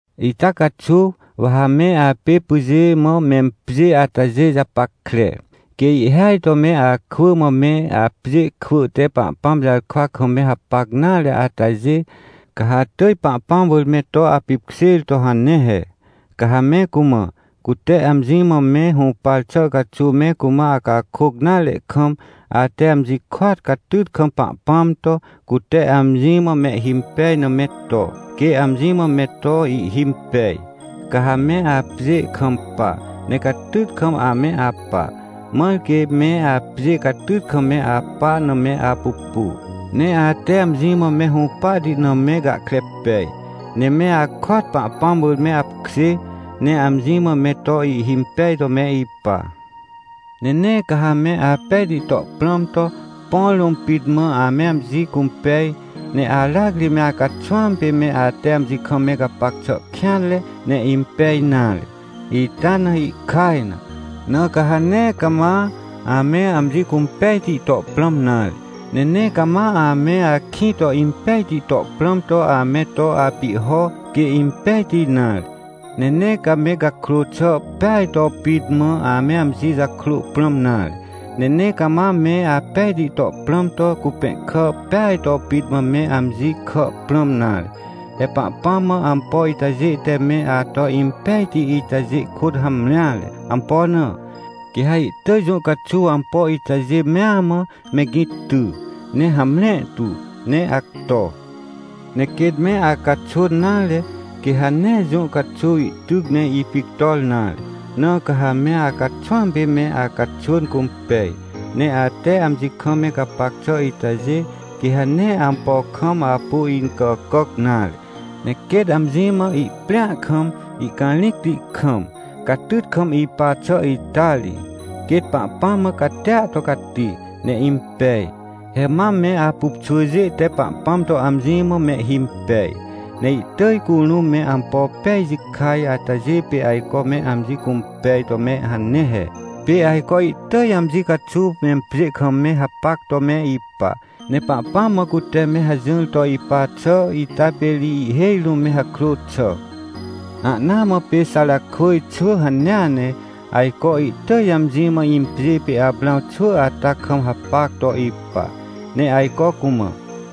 Ita caxuw, wa ha me apê pyjê mã mempjê atajê japackre. Quê ihhêaj to me akwỳ mã me apjê kwỳ te Pahpãm jarkwa kam me hapac nare atajê, ca ha atỳj Pahpãm wỳr me to apipkjêr to hane he. Ca ha me cumã, cute amji mã me hũpar xà caxuw me cumã acakôc nare kam, ate amji kôat catyt kam Pahpãm to, cute amji mã mehhimpej na me to, quê amji mã me to ihhimpej. Ca ha me apjê kampa, ne catyt kam ame apa, mãr quê me apjê catyt kam me apa na me apupu, ne ate amji mã me hũpahti na me gahkre pej, ne me akôat Pahpãm wỳr me apkjê, ne amji mã me to ihhimpej to me ipa. Ne nee ca ha me apejti to prãm to, põ rũm pit mã ame amji cũmpej, ne aracri me acaxwãm pê me ate amji kam me gapac xà kêanre, ne impej nare, ita na ihkaj na. Na ca ha nee cama ame amji cũmpejti to prãm nare, ne nee cama ame akĩ to impejti to prãm to ame to apihho, quê impejti nare. Ne nee ca me gakrô xà peaj to pit mã ame amji jakrô prãm nare, ne nee cama me apejti to prãm to cupẽhkà peaj to pit mã me amji kà prãm nare. He Pahpãm mã ampo itajê te me ato impejti itajê kôt hamreare. Ampo na? Quê ha ihtỳj jũ caxuw ampo itajê mea mã, me gĩ ty, ne hamre tu, ne acto. Ne quêt me acaxwỳn nare, quê ha nee jũ caxuw ihtyc ne ipictor nare. Na ca ha me acaxwãm pê me acaxwỳn cũmpej. Ne ate amji kam me gapac xà itajê, quê ha nee ampo kam apu incàcàc nare, ne quêt amji mã ihprĩa kam, ihcarĩcti kam, catyt kam ipa xà ita ri, quêt Pahpãm mã catia to cati, ne impej. He mam me apupxwỳjê te Pahpãm to amji mã mehhimpej, ne ihtỳj curũm me ampo pej jikaj atajê pê ajco me amji cũmpej to me hane he. Pê ajco ihtỳj amji caxuw mempjê kam me hapac to me ipa. Ne Pahpãm mã cute me hajỹr to ipa xà ita pê ri ihhêj rũm me hakrô xà. Ahnaa mã pê Xarakwỳj xwỳ hanea ne, ajco ihtỳj amji mã impjê pê Aprãw xwỳ ata kam hapac to ipa, ne ajco cumã: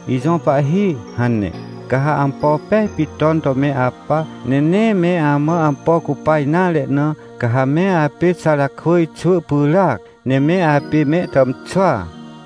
“Ijõ pahhi” hane. Ca ha ampo pej pit ton to me apa, ne nee me amã ampo cupa nare na, ca ha me apê Xarakwỳj xwỳ pyràac, ne me apê me tàmxwỳa.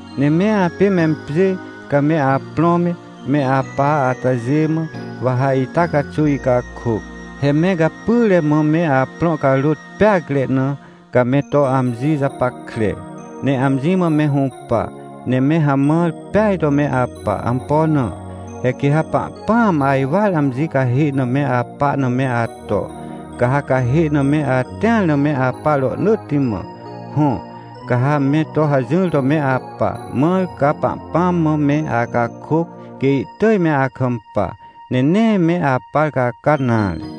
Ne me apê mempjê, ca me aprõ me, me apa atajê mã, wa ha ita caxuw icakôc. He me gapyre mã me aprõ carôt peacre na, ca me to amji japackre, ne amji mã me hũpa, ne me hamãr peaj to me apa. Ampo na? He quê ha Pahpãam ajwar amji cahê na me apa na me ato, ca ha cahê na me atĩar na me apa rohnỳtti mã. Hõ, ca ha me to hajỹr to me apa, mãr ca Pahpãm mã me acakôc, quê ihtỳj me akampa, ne nee me apar caca nare.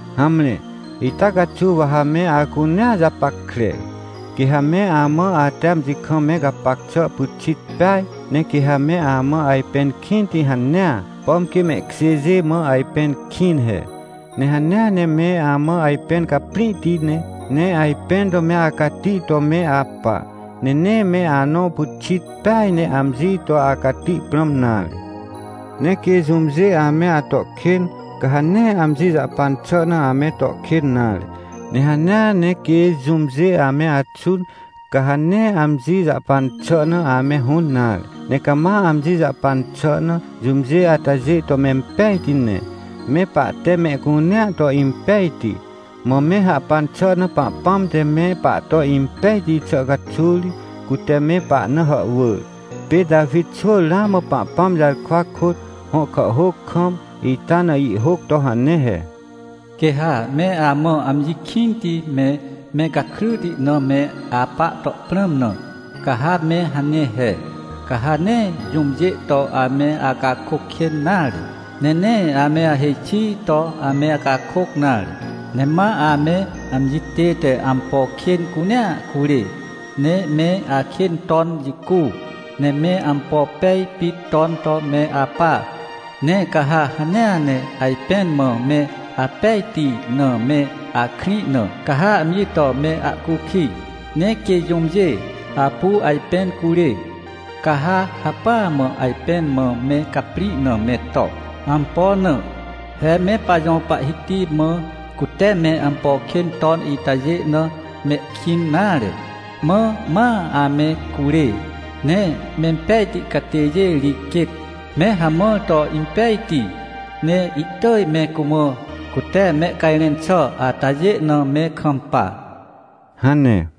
Hamre, ita caxuw wa ha me acunea japackre. Quê ha me amã ate amji kam me gapac xà pyxit peaj. Ne quê ha me amã ajpẽn kĩnti hanea, pom quê mehkjêjê mã ajpẽn kĩn he. Ne hanea ne me amã ajpẽn caprĩhti ne, ne ajpẽn to me acati to me apa, ne nee me anõ pyxit peaj ne amji to acati prãm nare. Ne quê jũmjê ame ato kên, ca ha nee amji jahpan xà na ame to kên nare. Ne hanea ne quê jũmjê ame axũn, ca ha nee amji jahpan xà na ame hũn nare. Ne cama amji jahpan xà na, jũmjê atajê to mempejti ne. Me pahte mehcunea to impejti, mã me hahpan xà na Pahpãm te me pahto impejti xà caxuw ri, cute me pahna hàhwỳr. Pê Tawi xwỳ ramã Pahpãm jarkwa kôt, hõ kàhhôc kam, ita na ihhôc to hane he: “Quê ha me amã amji kĩnti me, me gakryti na me apa to prãm na, ca ha me hane he: Ca ha nee jũmjê to ame acakôc kên nare. Ne nee ame ahêj xi to ame acakôc nare. Ne ma ame amji tête ampo kên cunea curê, ne me akên ton jicu, ne me ampo pej pit ton to me apa. Ne ca ha hanea ne ajpẽn mã me apejti na me akrĩ na, ca ha amji to me ahcukij. Ne quê jũmjê apu ajpẽn curê, ca ha hacpỹa mã ajpẽn mã me caprĩ na me to. Ampo na? He me pajõ Pahhiti mã cute me ampo kên ton itajê na mehkĩn nare, mã ma ame curê. Ne mempejti catêjê ri quêt, me hamãr to impejti, ne ihtỳj me cumã, cute mehcajrẽn xà atajê na me kampa” hane.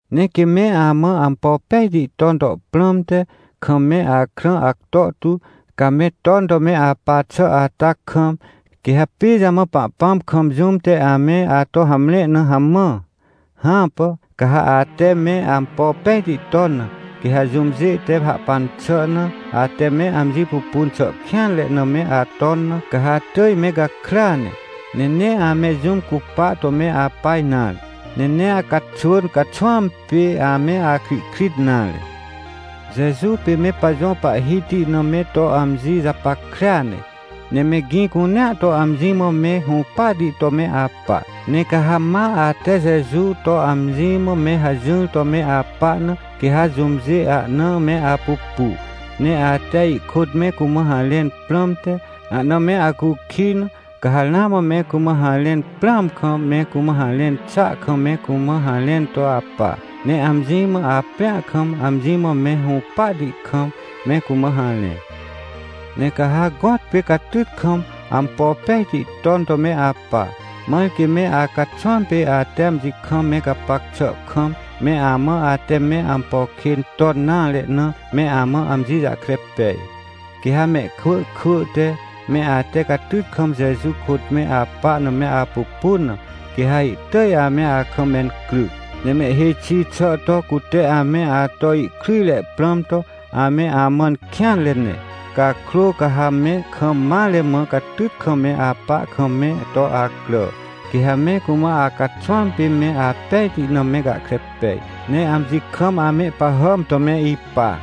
Ne quê me amã ampo pejti ton to prãmte, kam me akrã acto tu, ca me ton to me apa xà ata kam, quê ha pijamã Pahpãm kam jũm te ame ato hamre na hamã? Hãpà! Ca ha ate me ampo pejti ton na, quê ha jũmjê te hahpan xà na, ate me amji pupun xà kêanre na me aton na, ca ha atỳj me gakrya ne. Ne nee ame jũm cupa to me apa nare. Ne nee acaxwỳn caxwãm pê ame akrihkrit nare. Jeju pê me pajõ Pahhiti na me to amji japackrea ne, ne me gĩ cunea to amji mã me hũpahti to me apa. Ne ca ha ma ate Jeju to amji mã me hajỹr to me apa na, quê ha jũmjê ahna me apupu, ne ate ihkôt me cumã harẽn prãmte, ahna me acukij na, ca ha ramã me cumã harẽn prãam kam, me cumã harẽn xàa kam me cumã harẽn to apa. Ne amji mã aprĩa kam, amji mã me hũpahti kam, me cumã harẽ. Ne ca ha gõtpê catyt kam, ampo pejti ton to me apa, mãr quê me acaxwãm pê ate amji kam me gapac xà kam, me amã ate me ampo kên ton nare na, me amã amji jahkre pej. Quê ha mehkwỳ kwỳ te, me ate catyt kam Jeju kôt me apa na me apupun na, quê ha ihtỳj ame akam mencryc. Ne mehhêj xi xà to, cute ame ato ihkryjre prãm to, ame amãn kêanre ne. Cakrô ca ha me kam mare mã catyt kam me apa kam me to acrà, quê ha me cumã acaxwãm pê me apejti na me gahkre pej, ne amji kam amehpahàm to me ipa.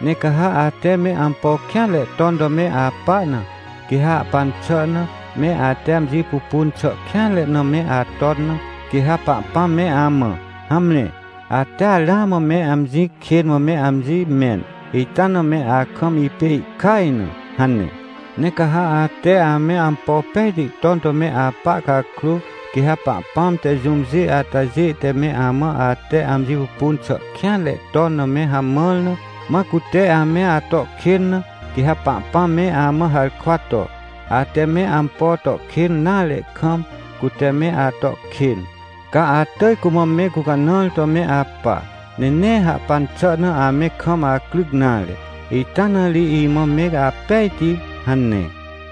Ne ca ha ate me ampo kêanre ton to me apa na, quê ha hahpan xà na, me ate amji pupun xà kêanre na me aton na, quê ha Pahpãm me amã: — Hamre, atea ramã me amji kên mã me amji mẽn, ita na me akam ipê ihkaj na — hane. Ne ca ha ate ame ampo pejti ton to me apa cakrô, quê ha Pahpãm te jũmjê atajê te me amã ate amji pupun xà kêanre ton na me hamãr na, mã cute ame ato kên na, quê ha Pahpãm me amã harkwa to: — Ate me ampo to kên nare kam, cute me ato kên. Ca atỳj cumã me gũcanãr to me apa, ne nee hahpan xà na ame kam acryc nare, ita na ri imã me apejti — hane.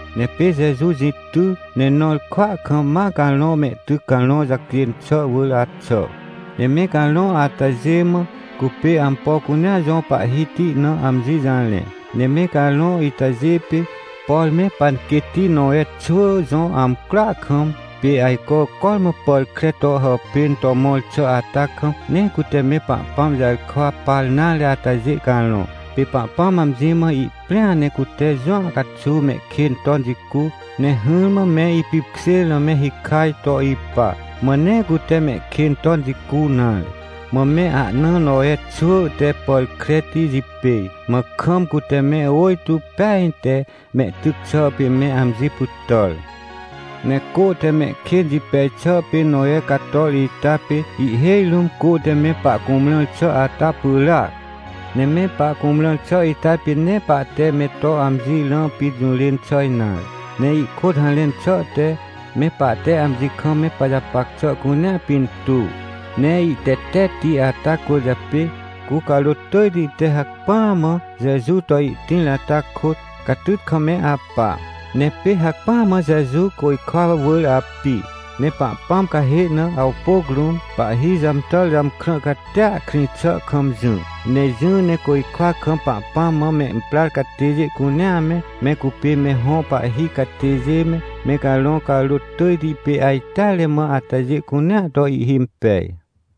Ne pê Jeju jĩ ty, ne nõr kwỳa kam, ma carõ mehtyc carõ jacjên xà wỳr axà, ne me carõ atajê mã, cupê ampo cunea jõ Pahhiti na amji jarẽ. Ne me carõ itajê pê, por me panquêtti Nowe xwỳ jõ amcroa kam, pê ajco cormã pàr kre to hàpên to mõr xà ata kam, nee cute me Pahpãm jarkwa par nare atajê carõ. Pê Pahpãm amji mã ihprĩa, ne cute jũa caxuw mehkên ton jicu, ne hỹrmã me ipipkjêr na me hikaj to ipa, mã nee cute mehkên ton jicu nare. Mã me ahnaa Nowe xwỳ te pàr kreti jipêj, mã kam cute me ôjtô peaj te mehtyc xà pê me amji pytàr. Ne cô te mehkên jipej xà pê Nowe cator ita pê, ihhêj rũm cô te me pahcumrãr xà ata pyràac. Ne me pahcumrãr xà ita pê nee pahte me to amji rã pit jũrên xà nare. Ne ihkôt harẽn xà te, me pahte amji kam me pajapac xà cunea pintuw, ne ihtetetti ata cwỳrjapê, cu carôt tỳjti te hacpỹa mã Jeju to ihtĩr ata kôt, catyt kam me apa. Ne pê hacpỹa mã Jeju côjkwa wỳr api, ne Pahpãm cahê na, awpôc rũm, pahhi jàmtàr jàmkrã catia krĩ xà kam jỹ. Ne jỹ ne côjkwa kam Pahpãm mã memprar catêjê cunea me, me cupê me hõ pahhi catêjê me, me carõ carôt tỳjti pê ajteare mã atajê cunea to ihhimpej.